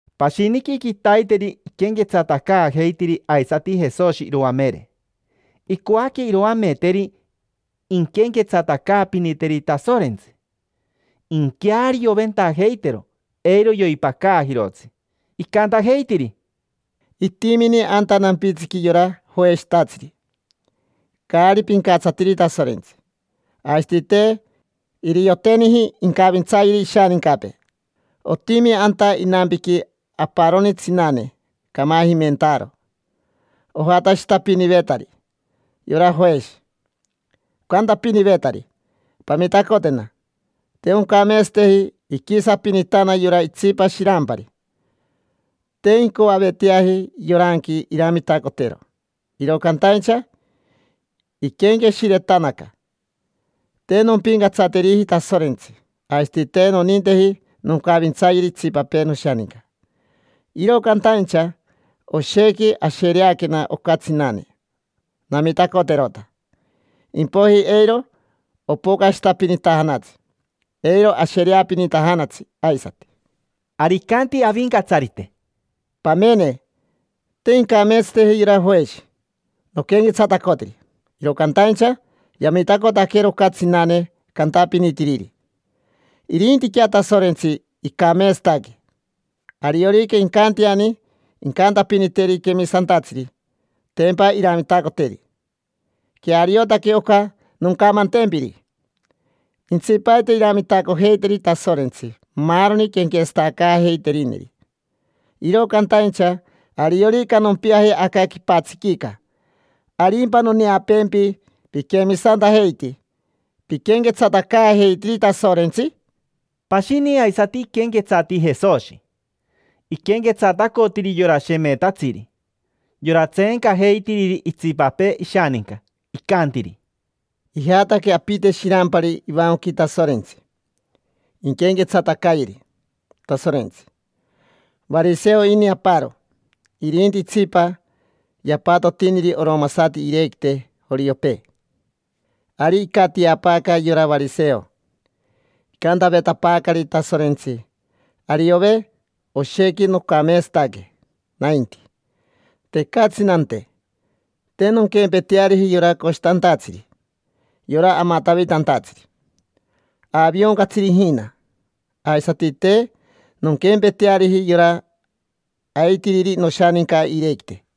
Pashiniqui quitaiteri iquenquetsatacaajeitiri aisati Jesoshi iroamere. Icoaque iroameteri inquenquetsatacaapiniteri Tasorentsi, inquearioventajeitero, eiro yoipacaajirotsi. Icantajeitiri: —Itimini anta nampitsiqui yora joeshitatsiri, caari pincatsatiri Tasorentsi. Aisati te irioteniji incavintsayeri ishanincapee. Otimi anta inampiqui aparoni tsinane, camajimentaaro. Ojatashitapinivetari yora joeshi, ocantapinivetari: “Pamitacotena, te oncameetsateji iquisapinitana yora itsipa shirampari”. Te incoaveteaji yoranqui iramitacotero, iro cantaincha iquenqueshiretanaca: “Te nompincatsateriji Tasorentsi, aisati te noninteji noncavintsayeri itsipapee noshaninca. Iro cantaincha oshequi ashereaquena oca tsinane. Namitacoterota, impoiji eiro opocashitapinitajanatsi, eiro ashereapinitajanatsi aisati”. Ari icanti Avincatsarite: —Pamene, te incameetsateji yora joeshi noquenquetsatacotiri, iro cantaincha yamitacotaquero oca tsinane cantapinitiriri. Irintiquea Tasorentsi, icameetsataque. Ariorica incanteani incantapiniteri quemisantatsiri, tempa iramitacoteri. Queariotaque oca noncamantempiri: intsipaite iramitacojeiteri Tasorentsi maaroni quenquetsatacaajeiterineri. Iro cantaincha ariorica nompiaje aca quipatsiquica ¿arimpa noneapeempi piquemisantajeiti, piquenquetsatacaajeitiri Tasorentsi? Pashini aisati iquenquetsati Jesoshi. Iquenquetsatacotiri yora shemetatsiri, yora tseencajeitiriri itsipapee ishaninca. Icantiri: —Ijataque apite shirampari ivancoqui Tasorentsi, inquenquetsatacayeri Tasorentsi. Variseo ini aparo, irinti itsipa yapatotiniri oromasati iirequite joriopee. Ari icatiapaaca yora variseo, icantavetapaacari: “Tasorentsi, ariove, oshequi nocameetsataque nainti. Tecatsi nante, te nonquempeteariji yora coshitantatsiri, yora amatavitantatsiri, aavioncatsiri ijina. Aisati te nonquempeteariji yora aitiriri noshaninca iirequite.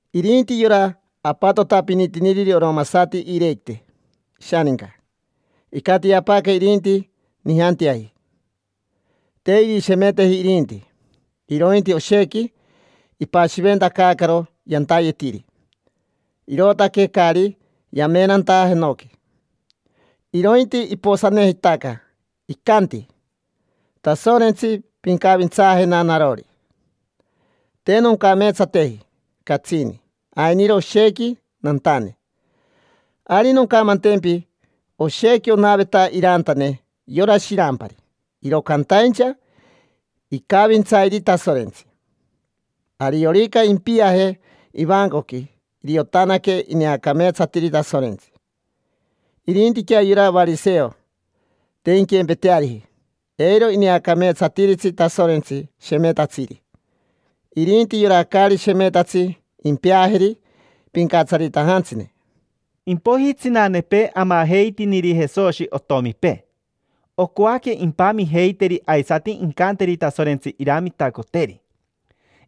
Irinti yora apatotapinitiniriri oromasati iirequite ishaninca, icatiapaaca irinti nijanteaji. Te irishemeteji irinti, irointi oshequi ipashiventacaacaro yantayetiri, irootaque caari yamenanta jenoqui, irointi iposanejitaca. Icanti: “Tasorentsi, pincavintsaajena narori, te noncameetsateji catsini, ainiro oshequi nantane”. Ari noncamantempi, oshequi onaveta irantane yora shirampari, iro cantaincha icavintsairi Tasorentsi. Ariorica impiaje ivancoqui iriotanaque ineacameetsatiri Tasorentsi. Irintiquea yora variseo, te inquempeteariji. Eiro ineacameetsatiritsi Tasorentsi shemetatsiri. Irinti yora caari shemetatsi impeajeri pincatsaritajantsine. Impoiji tsinanepee amajeitiniri Jesoshi otomipee, ocoaque impamijeiteri aisati incanteri Tasorentsi iramitacoteri.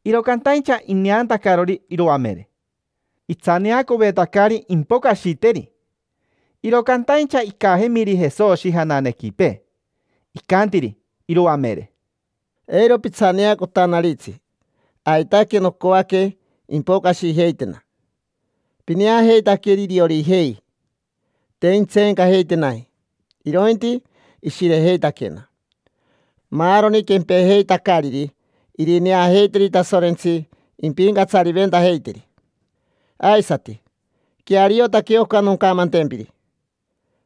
Iro cantaincha ineantacarori iroamere, itsaneacovetacari impocashiteri. Iro cantaincha icajemiri Jesoshi jananequipee, icantiri iroamere: —Eiro pitsaneacotanaritsi, aitaque nocoaque impocashijeitena. Pineajeitaqueri iriorijei: te intseencajeitenaji, irointi ishirejeitaquena. Maaroni quempejeitacariri irineajeiteri Tasorentsi impincatsariventajeiteri. Aisati, queariotaque oca noncamantempiri: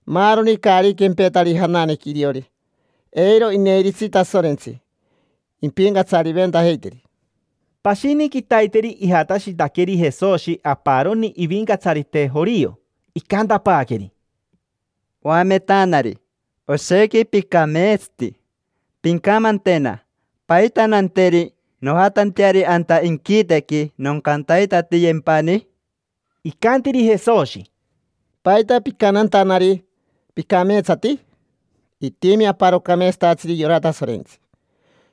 maaroni caari quempetari jananequi iriori, eiro ineiritsi Tasorentsi impincatsariventajeiteri. Pashini quitaiteri ijatashitaqueri Jesoshi aparoni ivincatsarite jorio. Icantapaaqueri: —Oametanari, oshequi picameetsati. Pincamantena: ¿paita nanteri nojatanteari anta inquitequi, noncantaitatiyempani? Icantiri Jesoshi: —¿Paita picantantanari: “Picameetsati”? Itimi aparo cameetsatatsiri, yora Tasorentsi.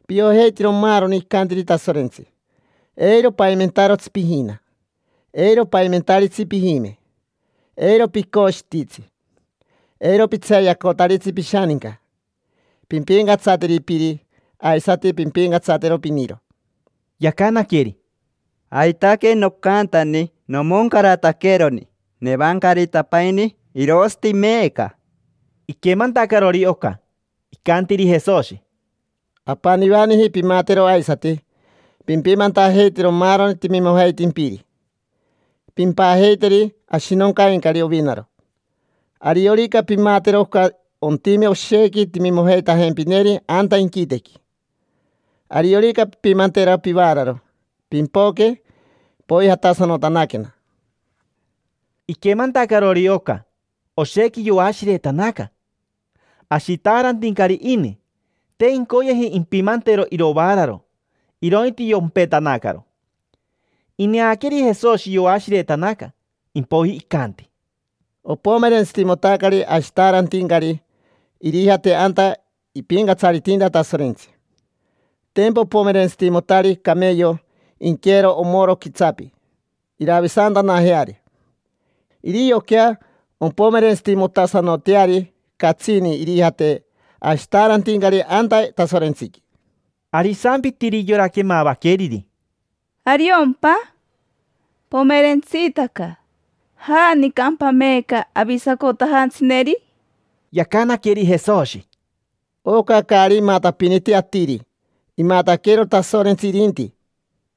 Piojeitiro maaroni icantiri Tasorentsi: “Eiro paimentarotsi pijina, eiro paimentaritsi pijime, eiro picoshititsi, eiro pitseeyacotaritsi pishaninca, pimpincatsateri piri, aisati pimpincatsatero piniro”. Yacanaqueri: —Aitaque nocantani nomoncarataqueroni: nevancaritapaini, irosati meeca. Iquemantacarori oca, icantiri Jesoshi: —Apanivaniji pimatero aisati: pimpimantajeitero maaroni timimojeitimpiri, pimpajeiteri ashinoncaincari ovinaro. Ariorica pimatero oca ontime oshequi timimojeitajempineri anta inquitequi. Ariorica pimpimantero pivaararo, pimpoque, poijatasanotanaquena. Iquemantacarori oca, oshequi yoashiretanaca. Ashitaarantincari ini, te incoyeji impimantero irovaararo, irointi yompetanacaro. Ineaqueri Jesoshi yoashiretanaca, impoiji icanti: —Opomerentsitimotacari ashitaarantincari irijate anta ipincatsaritinta Tasorentsi. Tempa opomerentsitimotari cameyo inqueero omoro quitsapi, iravisantanajeari. Irioquea ompomerentsitimotasanoteari catsini irijate ashitaarantincari anta Tasorentsiqui. Ari isampitiri yora quemavaqueriri: —¿Ariompa? Pomerentsitaca. ¿Janicampa meeca avisacotajantsineri? Yacanaqueri Jesoshi: —Oca caari imatapiniti atiri, imataquero Tasorentsi irinti.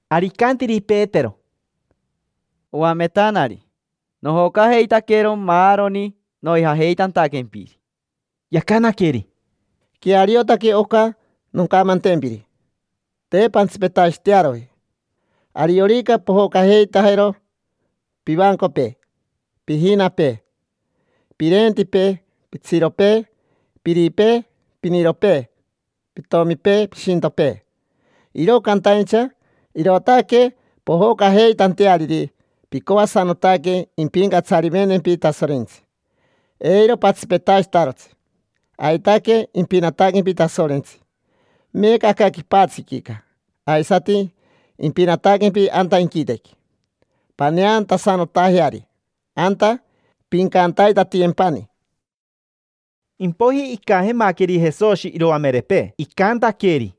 Ari icantiri Petero: —Oametanari, nojocajeitaquero maaroni noijajeitantaquempiri. Yacanaqueri: —Queariotaque oca noncamantempiri: te pantsipetashitearoji. Ariorica pojocajeitajero pivancopee, pijinapee, pirentipee, pitsiropee, piripee, piniropee, pitomipee, pishintopee: iro cantaincha irootaque pojocajeitanteariri picoasanotaque impincatsariventempi Tasorentsi, eiro patsipetashitarotsi. Aitaque impinataquempi Tasorentsi meeca aca quipatsiquica, aisati impinataquempi anta inquitequi: paneantasanotajeari anta, pincantaitatiyempani. Impoiji icajemaqueri Jesoshi iroamerepee, icantaqueri: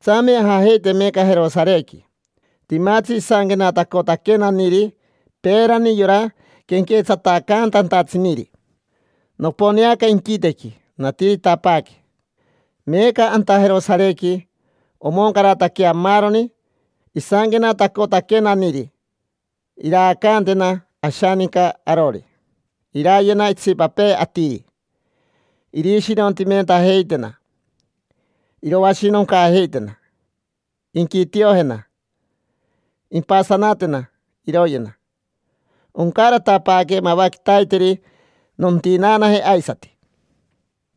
—Tsame ajajeite meeca Jerosarequi. Timatsi isanquenatacotaquenaniri peerani yora quenquetsatacantantatsiniri. Noponeaca inquitequi, natiritapaaque. Meeca anta Jerosarequi omoncarataquea maaroni isanquenatacotaquenaniri. Iraacantena ashaninca arori, irayena itsipapee atiri. Irishirontimentajeitena, iroashinoncaajeitena, inquitiojena, impasanatena, iroyena. Oncaratapaaque mava quitaiteri, nontinaanaje aisati.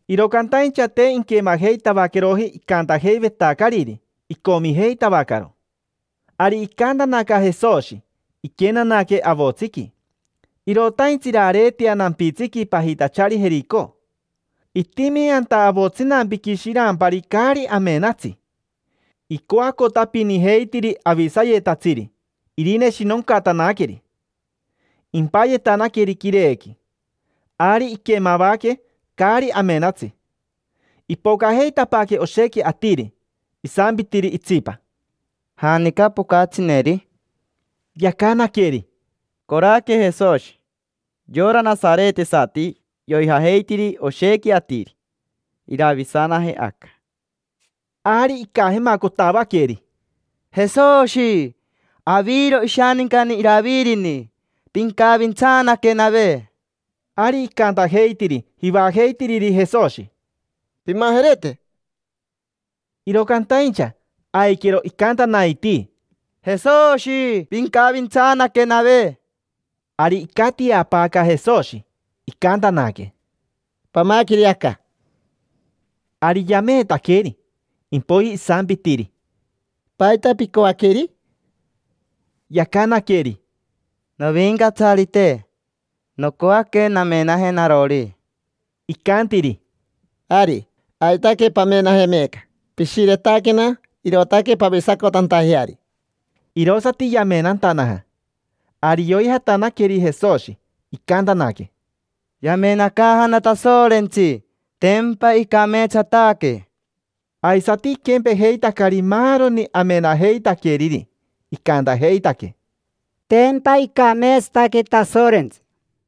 Iro cantaincha te inquemajeitavaqueroji icantajeivetacariri, icomijeitavacaro. Ari icaantanaca Jesoshi, iquenanaque avotsiqui, irotaintsi irareetea nampitsiqui pajitachari Jerico. Itimi anta avotsinampiqui shirampari caari amenatsi, icoacotapinijeitiri avisayetatsiri irineshinocatanaqueri, impayetanaqueri quirequi. Ari iquemavaque caari amenatsi ipocajeitapaaque oshequi atiri. Isampitiri itsipa: —¿Janica pocatsineri? Yacanaqueri: —Coraque Jesoshi, yora nasaretesati, yoijajeitiri oshequi atiri. Iravisanaje aca. Ari icajemacotavaqueri: —Jesoshi, aviro ishanincani Iravirini. Pincavintsaanaquenave. Ari icantajeitiri jivajeitiriri Jesoshi: —Pimajerete. Iro cantaincha, aiquero icantanaitii: —Jesoshi, pincavintsaanaquenave. Ari icatiapaaca Jesoshi, icantanaque: —Pamaqueri aca. Ari yameetaqueri. Impoiji isampitiri: —¿Paita picoaqueri? Yacanaqueri: —Novincatsarite, nocoaque namenaje narori. Icantiri: —Ari, aitaque pamenaje meeca. Pishiretaquena, irootaque pavisacotantajeari. Irosati yamenantanaja. Ari yoijatanaqueri Jesoshi, icantanaque: —Yamenacaajana Tasorentsi, tempa icameetsataque. Aisati iquempejeitacari maaroni amenajeitaqueriri, icantajeitaque: —Tempa icameetsataque Tasorentsi.